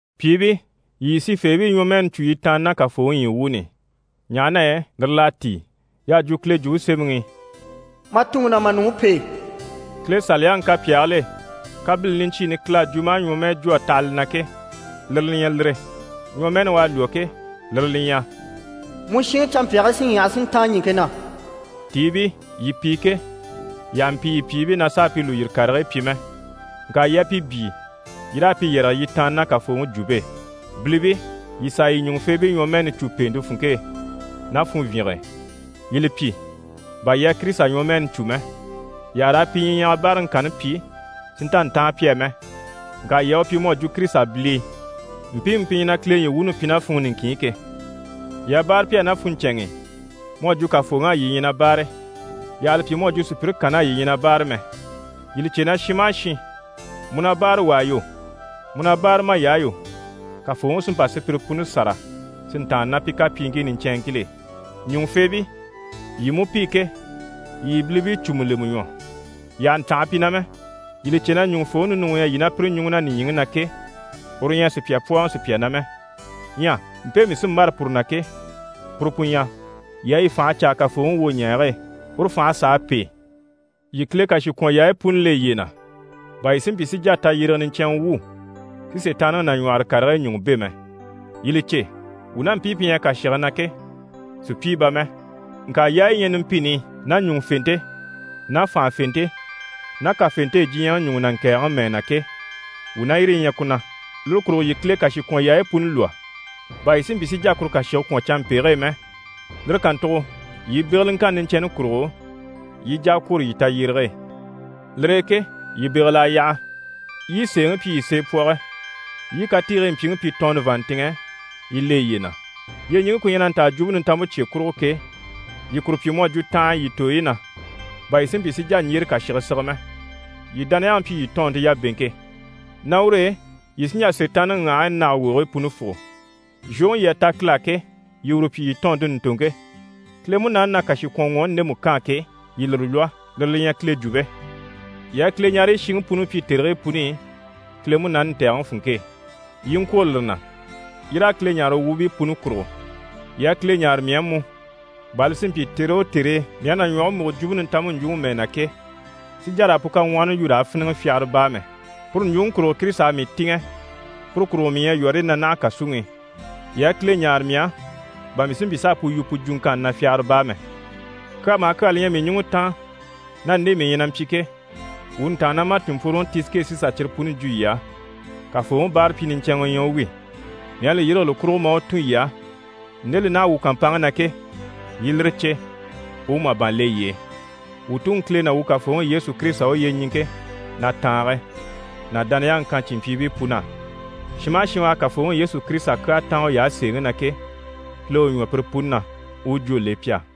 Pyìibii, yii yii sifeebii ɲwɔmɛɛni cû yii tàanna ná Kafooŋi ɲyii wuuni i, ɲaha na yɛ lire l'à tíi. Y'à jwo Kile Jwumpe Semɛŋi i «Ma tuŋi ná ma nuŋi pêe.» Kile Saliyaŋi kapyaagil'e, kabilini niɲcyiini Kile à jwo maa ɲwɔmɛɛ jwo a taha li na ke, lire li ɲyɛ lire. Ɲwɔmɛɛni u à lwɔ́ ke, lire li ɲyɛ: «Mu shìŋi canmpyaagii sí ɲyaha, si ntáan ɲìŋke na.» Tiibii, yii pi ke, yii àha mpi yii pyìibii na s'a pi lùyiri karigii pyi mɛ, ŋka yii a pi byíi, yii raa pi yɛrɛge yii tàanna ná Kafooŋi jwumpe e. Bilibii, yii sàa yii ɲùŋufeebii ɲwɔmɛɛni cû pèente funŋke e ná funvyinge e, yii li pyi bà yii à Kirisita ɲwɔmɛɛni cû mɛ. Yii àha raa pi ɲyiɲyaga báaraŋi kanni pyi si nta ntáan pi á mɛ, ŋka yii a u pyi mu à jwo Kirisita bilii, mpiimu pi ɲyɛ na Kile ɲyii wuuni pyi ná funŋɔ niŋkin i ke. Yii a báare pi á ná funɲcɛnŋ'i mu à jwo Kafooŋi á yii ɲyɛ na báare, yii àha li pyi mu à jwo sùpyire kann'á yii ɲyɛ na báare mɛ. Yii li cè na shin maha shin, mu na báare wà á yo, mu na báare may'á yo, Kafooŋi sí n‑pa sùpyire puni sâra si ntàanna ná pi kapyiiŋkii niɲcɛnŋkil'e. Ɲùŋufeebii, yii mú pi ke, yii yii bilibii cùmu lemɛ ɲwɔ, yii àha ntanha pi na mɛ. Yii li cè na ɲùŋufooŋi ninuŋi u ɲyɛ yii ná pire ɲùŋɔ na nìɲyiŋi na ke, uru ɲyɛ a sùpya pwɔ́ɔŋɔ sùpya na mɛ. Ɲyɛ mpe mii sí n‑bâra puru na ke, puru pu ɲyɛ: yii a yii fànhe caa Kafooŋi wwoɲɛɛge e, uru fành'à sàa pêe. Yii Kile kàshikwɔnyaayi puni le yiye na, bà yii si mpyi si jà tayyérege niɲcɛnŋɛ wwû, si Sitaanniŋi nàɲwɔhɔre karigii ɲùŋɔ bɛ̂ mɛ. Yii li cè, wuu ná mpii pi ɲyɛ kàshige na ke, sùpyii bà mɛ. Ŋka yaayi yi ɲyɛ numpini i ná ɲùŋufente ná fànhafente ná kafente e diɲyɛŋi ɲùŋɔ na ŋkɛ̀ɛgɛŋi mɛɛ na ke, wuu ná yire yi ɲyɛ ku na. Lire kurugo yii Kile kàshikwɔnyaayi puni lwɔ́, bà yii si mpyi si jà kuru kàshige kwɔ̀n canmpege e mɛ, lire kàntugo yii begeleŋkanni niɲcɛnni kurugo, yii i jà a kwôro yii tayyérege e. Lire e ke yii bégel'a yaha, yii i sèeŋi pyi yii seepwɔge, yii i katiigii mpyiŋi pyi tɔɔnnɔ vàanntinŋɛ yii le yiye na. Yyeɲiŋke ku ɲyɛ na ntaa Jwumpe Nintanmpe cye kurugo ke, yii kuru pyi mu à jwo tanhanya yii tooyi na, bà yii si mpyi si jà ɲjyére kàshige sige mɛ. Yii dániyaŋi pyi yii tɔɔnnte yabeŋke. Ná ur'e yii sí n‑jà Sitaanniŋi ŋyahigii nage wogigii puni fùgo. Zhwoŋi yii à ta Kile á ke, yii uru pyi yii tɔɔnnte ɲùntoŋke. Kile Munaani na kàshikwɔnŋwɔɔni ndemu kaan ke, yii lire lwɔ́, lire li ɲyɛ Kile jwumpe. Yii a Kileɲareyi shiŋi puni pyi tèrigii puni i, Kile Munaani ntɛ̀gɛŋi funŋke e, yii i ŋkwôro lire na. Yii raa Kile ɲáare u wuubii puni kurugo. Yii a Kile ɲáare mii á mú, bà li si mpyi tère o tère e mii à na ɲwɔge múgo Jwumpe Nintanmpe ɲjwuŋi mɛɛ na ke, si jà raa pu kaŋwɔhɔni yu raa fíniŋi fyagara baa mɛ. Puru ɲjwuŋi kurugo Kirisita à mii tìŋɛ, puru kurugo mii ɲyɛ yɔ̀rɔyi na naha kàsuŋi i. Yii a Kile ɲáare mii á, bà mii si mpyi s'a pu yu pu jwuŋkanni na fyagara baa mɛ. Kyaa maha kyaa li ɲyɛ mii ɲùŋɔ taan, ná nde mii ɲyɛ na mpyi ke, wuu ntàannamacinmpworoŋi Tisike sí n‑sà cyire puni jwo yii á. Kafooŋi báarapyi niɲcɛnŋɛ u ɲyɛ u wi. Mii à li yîrige li kurugo maa u tun yii á, nde li naha wuu kàmpanŋke na ke, yii i lire cè, u u màban le yii e. Wuu Tuŋi Kile ná wuu Kafooŋi Yesu Kirisita u yyeɲiŋke ná tàange ná dániyaŋi kan cìnmpyiibii pun'á. Shin maha shin u à Kafooŋi Yesu Kirisita kyaa táan uy'á sèeŋi na ke, Kile u ɲwɔ pire puni na, u u jwó le pi á!